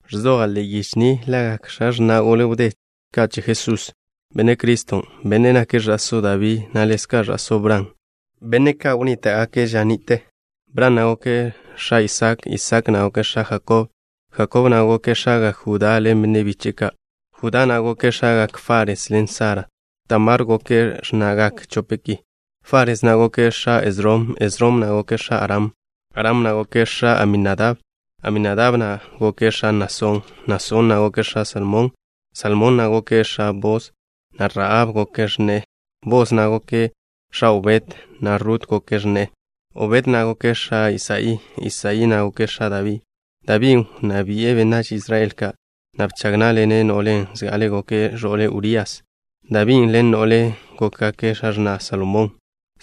Ẕzoja' ḻe'e yiche ni lagak x̱a x̱na' gole wdé ka' che Jesús, Benne' Criston', Bennen' nake' ẕa'só Dabí, na' ḻezka' ẕa'só Bran, benne' ka' wnnníta'gake' ža ni'te. Bran na' goke' x̱a Isak. Isak na' goke' x̱a Jakob. Jakob na' goke' x̱agak Judá ḻen benne' biche'e ka'. Judá na' goke' x̱agak Fares ḻen Sara. Tamar goke' x̱na'gak chope' ki. Fares na' goke' x̱a Esrom. Esrom na' goke' x̱a Aram. Aram na' goke' x̱a Aminadab. Aminadab na' goke' x̱a Nasón. Nasón na' goke' x̱a Salmón. Salmón na' goke' x̱a Bos, na' Rahab goke' x̱ne'e. Bos na' goke' x̱a Obed, na' Rut goke' x̱ne'e. Obed na' goke' x̱a Isaí. Isaí na' goke' x̱a Dabí. Dabín' wnná bi'e benách Israel ka', na' bchag ná'ḻene' no'len' zga'ale goke' ẕo'le Urías. Dabín' ḻen no'len' gókgake' x̱a x̱na' Salomón.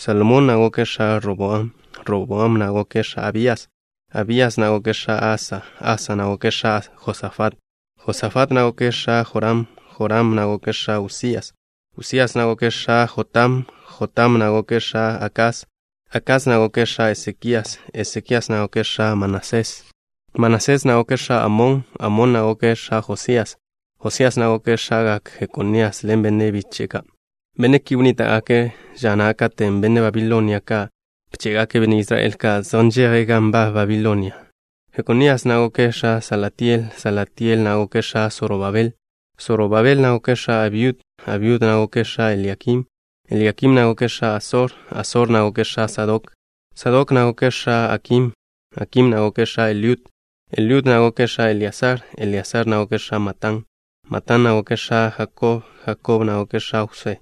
Salomón na' goke' x̱a Roboam. Roboam na' goke' x̱a Abías. Abías na' goke' x̱a Asa. Asa na' goke' x̱a Josafat. Josafat na' goke' x̱a Joram. Joram na' goke' x̱a Usías. Usías na' goke' x̱a Jotam. Jotam na' goke' x̱a Akás. Akás na' goke' x̱a Esekías. Esekías na' goke' x̱a Manasés. Manasés na' goke' x̱a Amón. Amón na' goke' x̱a Josías. Josías na' goke' x̱agak Jekonías ḻen benne' biche'e ka'. Benne' ki wnníta'gake' ža na' katen' benne' Babilonia ka' bché'gake' benne' Israel ka' zej nžeje' gan nbab Babilonia na'. Jekonías na' goke' x̱a Salatiel. Salatiel na' goke' x̱a Sorobabel. Sorobabel na' goke' x̱a Abiud. Abiud na' goke' x̱a Eliakim. Eliakim na' goke' x̱a Asor. Asor na' goke' x̱a Sadok. Sadok na' goke' x̱a Akim. Akim na' goke' x̱a Eliud. Eliud na' goke' x̱a Eleasar. Eleasar na' goke' x̱a Matán. Matán na' goke' x̱a Jakob. Jakob na' goke' x̱a Jwsé.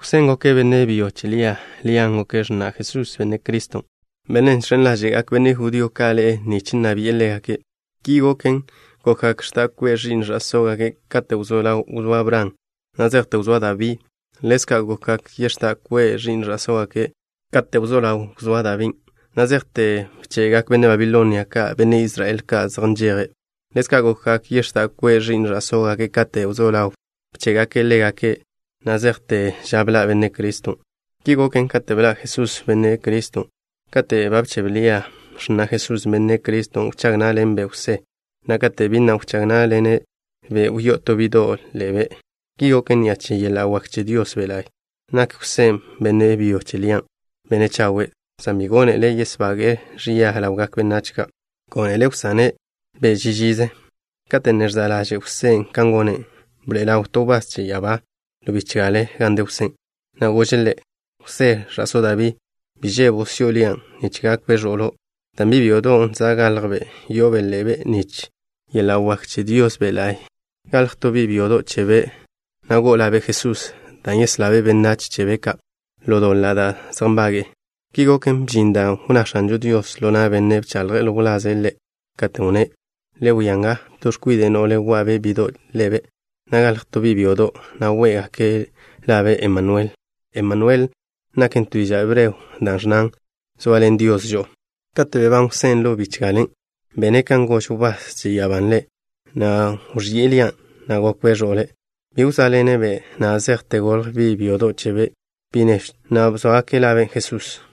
Jwsén' goke' benne' byo che Lia. Lian' goke' x̱na' Jesús, Benne' Criston', Bennen' žx̱en ḻáže'gak benne' judío ka' ḻe'e nich nna bi'e ḻégake'. Ki goken, gokgak x̱da' kwe' ẕi'n sógake' kate' wzó ḻaw wzóa Bran, na' zejte wzóa Dabí. Ḻezka' gokgak yex̱dá' kwe' ẕi'n sógake' kate' wzó ḻaw wzóa Dabín', na' zejte bche'gak benne' Babilonia ka' benne' Israel ka' zej nžeje'. Ḻezka' gokgak yex̱dá' kwe' ẕi'n sógake' kate' wzó ḻaw bché'gake' ḻégake', na' zejte ža bḻa' Benne' Criston'. Ki goken kate' bḻa' Jesús, Benne' Criston'. Katen' ba bchebe ḻaže' Lia, x̱na' Jesús, Benne' Criston', wchág ná'ḻenbe' Jwsé, na' kate' bi na' wchág ná'ḻene'-be', wyó'o to bi'do' ḻe'be'. Ki goken ni'a che yeḻa' wak che Dios Be' La'y. Nak Jwsén', benne' byo che Lian', benne' chawe', san bi gónele' yesbage'e-be' ẕia ḻawgak benách ka'. Gónele' wsane'-be' ži žize. Kate' ne ẕza' ḻaže' Jwsén' kan gone', bḻa' ḻaw to wbás che ya'abá ḻo bichgale gan de Jwsén', na' gože' ḻe': —Jwsé, ẕa'só Dabí. Bi žebo' si'o Lian', nich gakbe' ẕo'lo', dan' bi' byodon' za' galjbe', yo'obe' ḻe'be' ni'a che yeḻa' wak che Dios Be' La'y. Galj to bi' byodo' chebe', na' go'o labe' Jesús, dan' yeslabe' benách chebe' ka' ḻo doḻa' da' zej nbage'e. Ki goken, bžin dan' wnná X̱anžo Dios ḻo na' benne' bchaḻje' ḻo wlaze' Ḻe', katen' wnné': Le wia nga, to x̱kwide' no'le, wa'be' bi'do' ḻe'be', na' galj to bi' byodo', na' wé'gake' labe' Emanuel. Emanuel naken to diža' hebreo dan' ẕnnan: “Zoaḻen Dios žo'o.” Kate' bebán Jwsé ḻo bichgalen', bene' kan gož wbás che ya'abán' ḻe', na' wẕi'e Lian', na' gokbe' ẕo'le'. Bi wzóaḻene'-be' na' zejte golj bi' byodo' chebe', bi' nežw chebe', na' bzóagake' labe' Jesús.